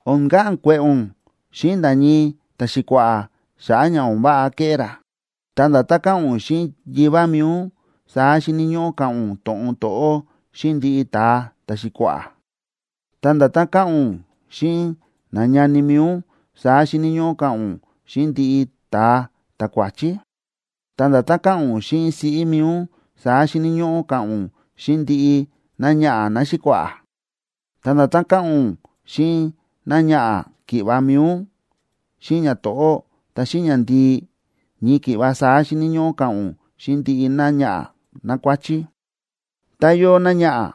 O̱n ka̱ꞌa̱n kue̱ꞌe̱ ún xíꞌin nda̱ ñii ta̱xi̱kua̱ꞌa̱ xa̱ꞌa̱ ña o̱n váꞌa ke̱ꞌé ra, ta nda̱tán ka̱ꞌa̱n ún xíꞌin yivá mi̱i ún, saá xíni̱ ñóꞌó ka̱ꞌa̱n ún to̱ꞌon to̱ꞌó xíꞌin ndiꞌi ta̱a ta̱xi̱kua̱ꞌa̱. Ta nda̱tán ka̱ꞌa̱n ún xíꞌin nañani mi̱i ún, saá xíni̱ ñóꞌó ka̱ꞌa̱n ún xíꞌin ndiꞌi ta̱a ta̱kuáchí. Ta nda̱tán ka̱ꞌa̱n ún xíꞌin siꞌí mi̱i ún, saá xíni̱ ñóꞌó ka̱ꞌa̱n ún xíꞌin ndiꞌi náñaꞌa̱ náxi̱kua̱ꞌa̱. Ta nda̱tán ka̱ꞌa̱n ún xíꞌin náñaꞌa̱ ki̱ꞌva̱ mi̱i ún, xíꞌin ñato̱ꞌó, ta xíꞌin ñandii, ñii ki̱ꞌva saá xíni̱ ñóꞌó ka̱ꞌa̱n ún xíꞌin ndiꞌi náñaꞌa̱ nákuáchí. Tá yóo náñaꞌa̱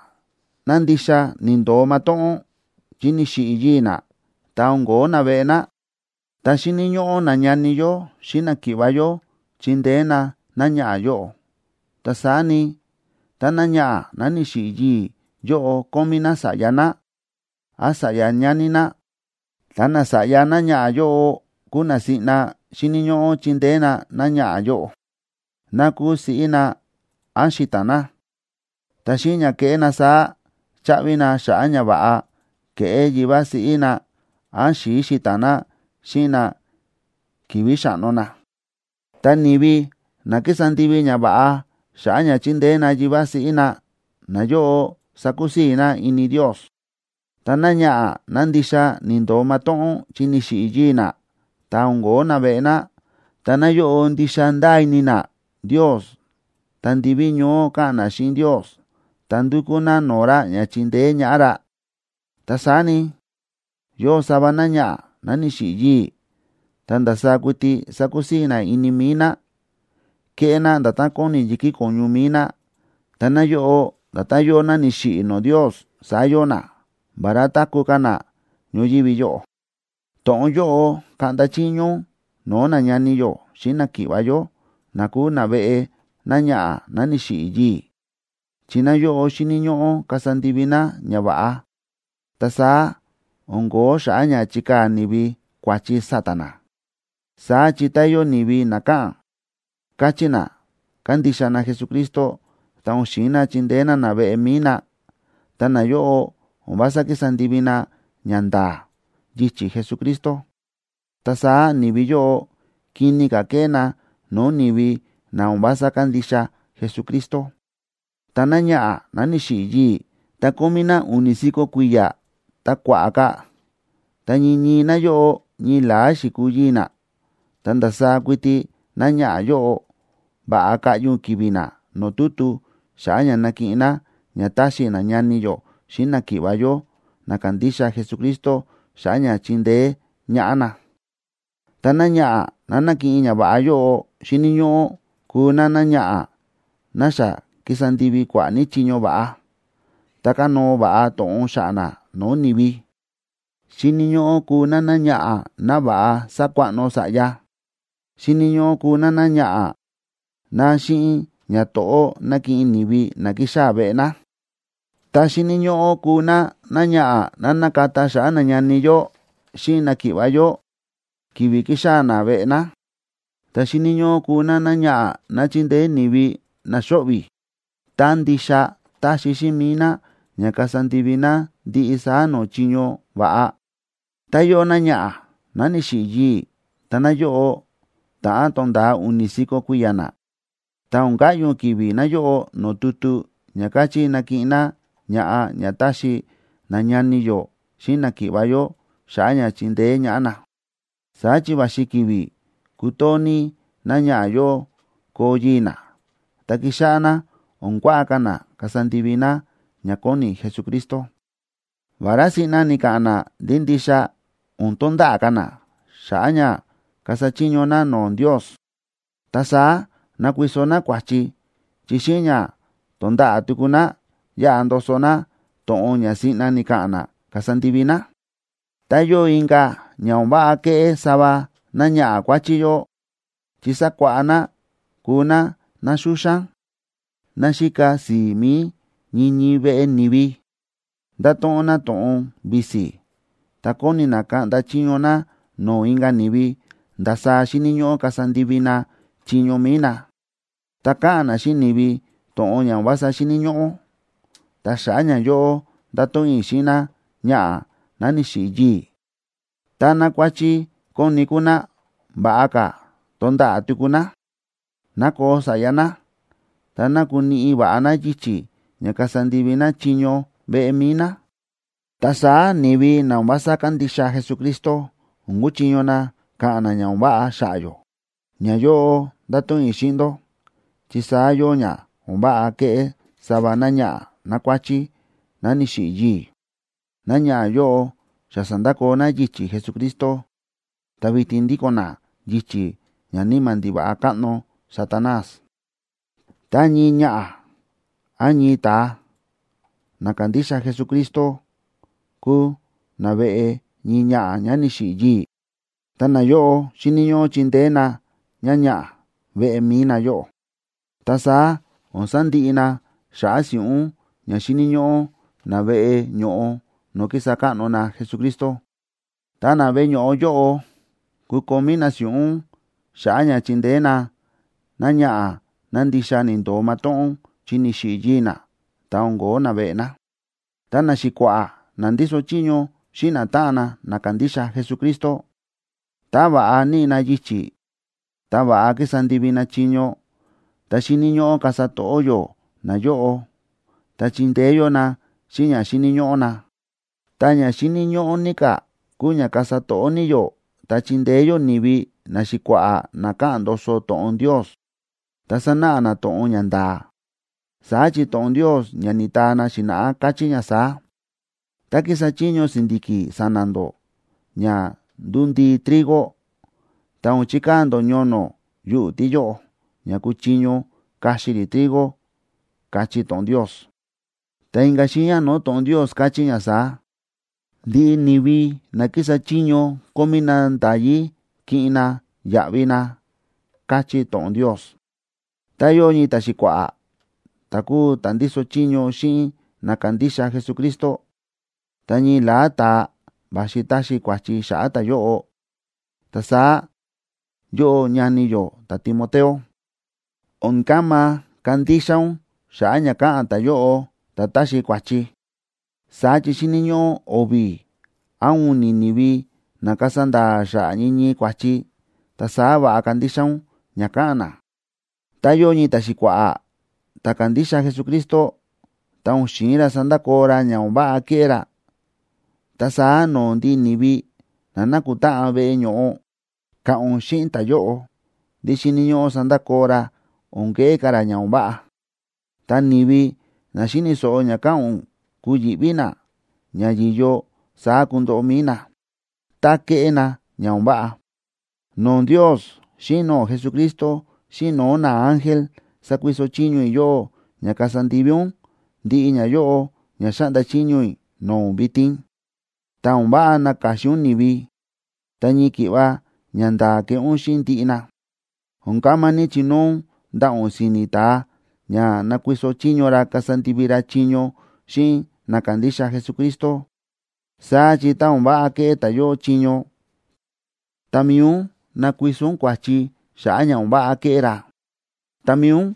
ná ndixa ni̱ndo̱o matóꞌón, chi ni̱xiꞌi̱ yii̱ ná, ta o̱n ko̱ó naveꞌe ná, ta xíni̱ ñóꞌó nañani yó xíꞌin náki̱ꞌva̱ yó chindeé na náñaꞌa̱ yóꞌo. Tá saá ni, tá náñaꞌa̱ ná ni̱xiꞌi̱ yii̱ yóꞌo kómí ná sa̱ꞌya ná, án sa̱ꞌya ñani ná, ta nasa̱ꞌya náñaꞌa̱ yóꞌo kúu na siꞌna xíni̱ ñóꞌó chindeé na náñaꞌa̱ yóꞌo, ná kúu siꞌí na án xi̱ta̱n na. Ta xíꞌin ña keꞌé na saá, chaꞌvi na xa̱ꞌa̱ ñava̱ꞌa ke̱ꞌé yivá siꞌí na án xi̱i̱ xi̱ta̱n na xíꞌin na ki̱vi̱ xáꞌno na. Ta ni̱vi na kísa ndivi ñava̱ꞌa xa̱ꞌa̱ ña chindeé na yivá siꞌí na, nayóꞌo sákusii̱ na ini Ndios. Ta náñaꞌa̱ ná ndixa ni̱ndo̱o matóꞌón, chi ni̱xiꞌi̱ yii̱ ná, ta o̱n ko̱ó naveꞌe ná, ta náyóꞌo ndixa ndáa ini ná Ndios ta ndiví ñoó káꞌa̱n ná xíꞌin Ndios, ta ndúkú ná no̱o̱ ra ña chindeé ñaꞌá ra. Ta saá ni, yóo sava náñaꞌa̱ ná ni̱xiꞌi̱ yii̱, ta ndasaá kuiti sákusii̱ ná ini mi̱i ná, kéꞌé ná nda̱tán kóni yi̱kí ko̱ñu mi̱i ná, ta náyóꞌo nda̱tán yóo ná ni̱xiꞌi̱ no̱o̱ Ndios, saá yóo ná, vará táku̱ ka̱ ná ñoyívi yóꞌo. To̱ꞌon yóꞌo kaꞌnda chiño ún no̱o̱ nañani yó xíꞌin náki̱ꞌva̱ yó, na kúu naveꞌe náñaꞌa̱ ná ni̱xiꞌi̱ yii̱, chi nayóꞌo xíni̱ ñóꞌó kasa ndivi na ñava̱ꞌa. Ta saá o̱n kóo xa̱ꞌa̱ ña chikaa̱ ni̱vi kua̱chi sa̱ta̱ na. Saá chi tá yóo ni̱vi na káꞌa̱n, káchí na kándixa na Jesucristo, ta o̱n xi̱in na chindeé na naveꞌe mi̱i na, ta nayóꞌo o̱n vása kísa ndivi na ñanda̱a̱ yichi̱ Jesucristo, ta saá ni̱vi yóꞌo kini ka̱ kéꞌé na no̱o̱ ni̱vi na o̱n vása kándixa Jesucristo. Ta náñaꞌa̱ ná ni̱xiꞌi̱ yii̱, ta kómí ná u̱ni̱ si̱ko̱ kui̱ya̱ ta kua̱ꞌa̱ ka̱, ta ñii ñii náyóꞌo ñii la̱á xi̱kuu yii̱ ná, ta ndasaá kuiti náñaꞌa̱ yóꞌo, va̱ꞌa kaꞌyi ún ki̱vi̱ ná no̱o̱ tutu xa̱ꞌa̱ ña nakiꞌin ná ña taxi nañani yó xíꞌin náki̱ꞌva̱ yó na kándixa Jesucristo xa̱ꞌa̱ ña chindeé ñaꞌá na. Ta náñaꞌa̱ ná nakiꞌin ñava̱ꞌa yóꞌo xíni̱ ñóꞌó kuu náñaꞌa̱ ná xa ki̱sa ndivi kua̱ꞌa̱ ní chiño va̱ꞌa, ta kánóo va̱ꞌa to̱ꞌon xa̱ꞌa̱ ná no̱o̱ ni̱vi. Xíni̱ ñóꞌó kuu ná náñaꞌa̱ ná va̱ꞌa sa̱kuaꞌno sa̱ꞌya, xíni̱ ñóꞌó kuu ná náñaꞌa̱ ná xíꞌin ñato̱ꞌó na̱kiꞌin ni̱vi na ki̱xaa̱ veꞌe ná, ta xíni̱ ñóꞌó kuu ná náñaꞌa̱ ná xa na̱kata xa̱ꞌa̱ nañani yó xíꞌin náki̱ꞌva̱ yó ki̱vi̱ ki̱xaa̱ na veꞌe ná, ta xíni̱ ñóꞌó kuu ná náñaꞌa̱ ná chi̱ndeé ni̱vi na xóꞌvi̱, ta ndixa ta̱xi xíꞌin mi̱i ná ña kasa ndivi ná ndiꞌi saá no̱o̱ chiño va̱ꞌa. Ta yóo náñaꞌa̱ ná ni̱xiꞌi̱ yii̱, ta náyóꞌo ta̱ꞌán tonda̱a u̱ni̱ si̱ko̱ kui̱ya̱ ná, ta o̱n kaꞌyi ún ki̱vi̱ náyóꞌo no̱o̱ tutu ña káchí nakiꞌin ná ña̱ꞌa ña taxi nañani yó xíꞌin náki̱ꞌva̱ yó xa̱ꞌa̱ ña chindeé ñaꞌá na. Saá chi va̱xi ki̱vi̱ kutoo ní náñaꞌa̱ yóꞌo koo yii̱ ná, ta kixáꞌá ná o̱n kuaꞌa ka̱ ná kasa ndivi ná ña kóni Jesucristo, vará siꞌna ni̱ka̱ꞌa̱n ná ndí ndixa o̱n tonda̱ꞌa̱ ka̱ ná xa̱ꞌa̱ ña kasa chiño ná no̱o̱ Ndios. Ta saá nakuiso ná kua̱chi, chi xíꞌin ña tonda̱ꞌa̱ tuku ná, yaꞌa ndoso ná to̱ꞌon ña siꞌna ni̱ka̱ꞌa̱n ná kasa ndivi ná. Ta yóo inka̱ ña o̱n váꞌa kéꞌé sava náñaꞌa̱ kuáchí yóꞌo, chi sákuáꞌá ná kuu ná ná xúxán, ná xíka si̱i̱ mi̱i ñii ñii veꞌe ni̱vi, ndáto̱ꞌon ná to̱ꞌon visi, ta kóni ná kaꞌnda chiño ná no̱o̱ inka̱ ni̱vi ndasaá xíni̱ ñóꞌó kasa ndivi na chiño mi̱i na, ta káꞌa̱n ná xíꞌin ni̱vi to̱ꞌon ña o̱n vása xíni̱ ñóꞌó. Ta xa̱ꞌa̱ ñayóꞌo ndáto̱ꞌon i̱ xíꞌin náñaꞌa̱ ná ni̱xiꞌi̱ yii̱, ta nákuáchí kóni kúu ná, va̱ꞌa ka̱ tonda̱ꞌa̱ tuku ná, ná koo sa̱ꞌya ná, ta ná kuniꞌi va̱ꞌa ná yichi̱ ña kasa ndivi ná chiño veꞌe mi̱i ná. Ta saá ni̱vi na o̱n vása kándixa Jesucristo o̱n kuchiño na ka̱ꞌa̱n na ña o̱n váꞌa xa̱ꞌa̱ yó. Ñayóꞌo ndáto̱ꞌon i̱ xíꞌin ndó, chi saá yóo ña o̱n váꞌa ke̱ꞌé sava náñaꞌa̱ nákuáchí ná ni̱xiꞌi̱ yii̱. Náñaꞌa̱ yóꞌo xa sa̱ndakoo ná yichi̱ Jesucristo ta vitin ndíko̱n ná yichi̱ ñaníma̱ ndiva̱ꞌa káꞌno Satanás. Tá ñii ñaꞌa̱ án ñii ta̱a na kándixa Jesucristo kúu naveꞌe ñii ñaꞌa̱ ñá ni̱xiꞌi̱ yii̱, ta nayóꞌo xíni̱ ñóꞌó chindeé na ñáñaꞌa̱ veꞌe mi̱i nayóꞌo. Ta saá o̱n sandiꞌi na xa̱ꞌa̱ si̱ꞌún ña xíni̱ ñóꞌó na veꞌe ño̱ꞌo no̱o̱ kísa káꞌno na Jesucristo, ta na veꞌe ño̱ꞌo yóꞌo kukomí na si̱ꞌún xa̱ꞌa̱ ña chindeé na náñaꞌa̱ ná ndixa ni̱ndo̱o matóꞌón, chi ni̱xiꞌi̱ yii̱ ná, ta o̱n ko̱ó naveꞌe ná. Ta naxi̱kua̱ꞌa̱ na ndíso chiño xíꞌin natáꞌan na na kándixa Jesucristo, tá va̱ꞌa níꞌi na yichi̱ ta va̱ꞌa kísa ndivi na chiño, ta xíni̱ ñóꞌó kasa to̱ꞌó yó nayóꞌo, ta chindeé yó na xíꞌin ña xíni̱ ñóꞌó na. Ta ña xíni̱ ñóꞌó ní ka̱ kúu ña kasa to̱ꞌó ní yó ta chindeé yó ni̱vi naxi̱kua̱ꞌa̱ na káꞌa̱n ndoso to̱ꞌon Ndios, ta sánáꞌa na to̱ꞌon ña nda̱a̱. Saá chi to̱ꞌon Ndios ña ni̱taa na xi̱na̱ꞌá káchí ña saá: “Tá kísa chiño si̱ndi̱ki̱ sa̱na̱ ndó ña ndundii trigo, ta o̱n chikaa̱ ndó ñono̱ yuꞌu̱ tíyóꞌo, ña kuchiño kaxi rí trigo”, káchí to̱ꞌon Ndios. Ta inka̱ xiiña no̱o̱ to̱ꞌon Ndios káchí ña saá: “Ndiꞌi ni̱vi na kísa chiño kómí na nda̱yí kiꞌin na yaꞌvi na”, káchí to̱ꞌon Ndios. Tá yóo ñii ta̱xi̱kua̱ꞌa̱ ta̱ kúu ta̱ ndíso chiño xíꞌin na kándixa Jesucristo, ta ñii la̱á ta̱a va̱xi taxi kua̱chi xa̱ꞌa̱ ta̱yóꞌo, ta saá yóꞌó ñani yó ta̱Timoteo, o̱n kama kandixa ún xa̱ꞌa̱ ña káꞌa̱n ta̱yóꞌo ta̱ táxi kua̱chi. Saá chi xíni̱ ñóꞌó o̱vi̱ án u̱ni̱ ni̱vi na kasa nda̱a̱ xa̱ꞌa̱ ñii ñii kua̱chi, ta saá va̱ꞌa kandixa ún ña káꞌa̱n na. Tá yóo ñii ta̱xi̱kua̱ꞌa̱ ta̱ kándixa Jesucristo, ta o̱n xi̱in ra sandakoo ra ña o̱n váꞌa kéꞌé ra, ta saá no̱o̱ ndiꞌi ni̱vi na nákutáꞌan veꞌe ño̱ꞌo, ka̱ꞌa̱n ún xíꞌin ta̱yóꞌo ndí xíni̱ ñóꞌó sandakoo ra o̱n keꞌé ka̱ ra ña o̱n váꞌa. Ta ni̱vi na xíni̱ so̱ꞌo ña ka̱ꞌa̱n ún, kuyi̱ꞌví na ña yi̱yo saá kundoꞌo mi̱i na, tá keꞌé na ña o̱n váꞌa. No̱o̱ Ndios xíꞌin no̱o̱ Jesucristo xíꞌin no̱o̱ naángel, sákuiso chiño i̱ yóꞌó ña kasa ndivi ún ndiꞌi ñayóꞌo ña xáꞌnda chiño i̱ no̱o̱ ún vitin, ta o̱n váꞌa naka̱xin ún ni̱vi, ta ñii ki̱ꞌva ñanda̱a̱ keꞌé ún xíꞌin ndiꞌi na. O̱n kama ní chinóo ún ndaꞌa̱ ún si̱ni̱ ta̱a ña nakuiso chiño ra kasa ndivi ra chiño xíꞌin na kándixa Jesucristo. Saá chi tá o̱n váꞌa keꞌé ta̱yóꞌo chiño, ta mi̱i ún nakuiso ún kua̱chi xa̱ꞌa̱ ña o̱n váꞌa ke̱ꞌé ra. Ta mi̱i ún,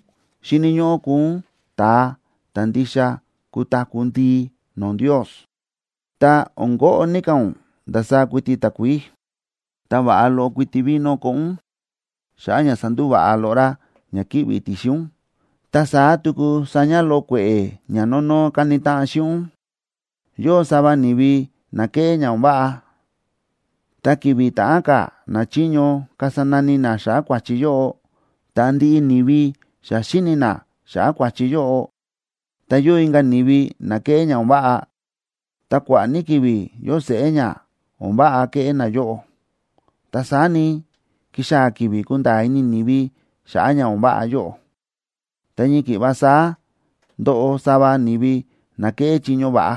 xíni̱ ñóꞌó kuu ún ta̱a ta̱ ndixa kutaku̱ ndii no̱o̱ Ndios. Ta o̱n koꞌo ní ka̱ ún ndasaá kuiti takuií, ta va̱ꞌa loꞌo kuiti vino koꞌo ún, xa̱ꞌa̱ ña sandúva̱ꞌa loꞌo rá ña kíꞌvi̱ ti̱xin ún, ta saá tuku sa̱ña̱ loꞌo kue̱ꞌe̱ ña nónó káni táꞌan xíꞌin ún. Yóo sava ni̱vi na kéꞌé ña o̱n váꞌa, ta ki̱vi̱ ta̱ꞌán ka̱ nachiño kasa nani na xa̱ꞌa̱ kua̱chi yóꞌo, ta ndiꞌi ni̱vi xa xíni̱ na xa̱ꞌa̱ kua̱chi yóꞌo. Ta yóo inka̱ ni̱vi na kéꞌé ña o̱n váꞌa, ta kua̱ꞌa̱ ní ki̱vi̱ yóo seꞌé ña o̱n váꞌa ke̱ꞌé nayóꞌo. Ta saá ni, kixaa̱ ki̱vi̱ kunda̱a̱ ini ni̱vi xa̱ꞌa̱ ña o̱n váꞌa yóꞌo. Ta ñii ki̱ꞌva saá ndóꞌo sava ni̱vi na kéꞌé chiño va̱ꞌa,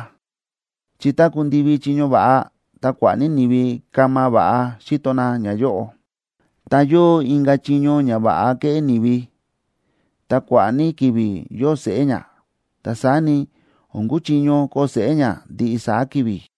chi tá ku̱ndivi chiño va̱ꞌa, ta kua̱ꞌa̱ ní ni̱vi kama va̱ꞌa xíto na ñayóꞌo. Ta yóo inka̱ chiño ña váꞌa kéꞌé ni̱vi, ta kua̱ꞌa̱ ní ki̱vi̱ yóo seꞌé ña, ta saá ni, o̱n kuchiño koo seꞌé ña ndiꞌi saá ki̱vi̱.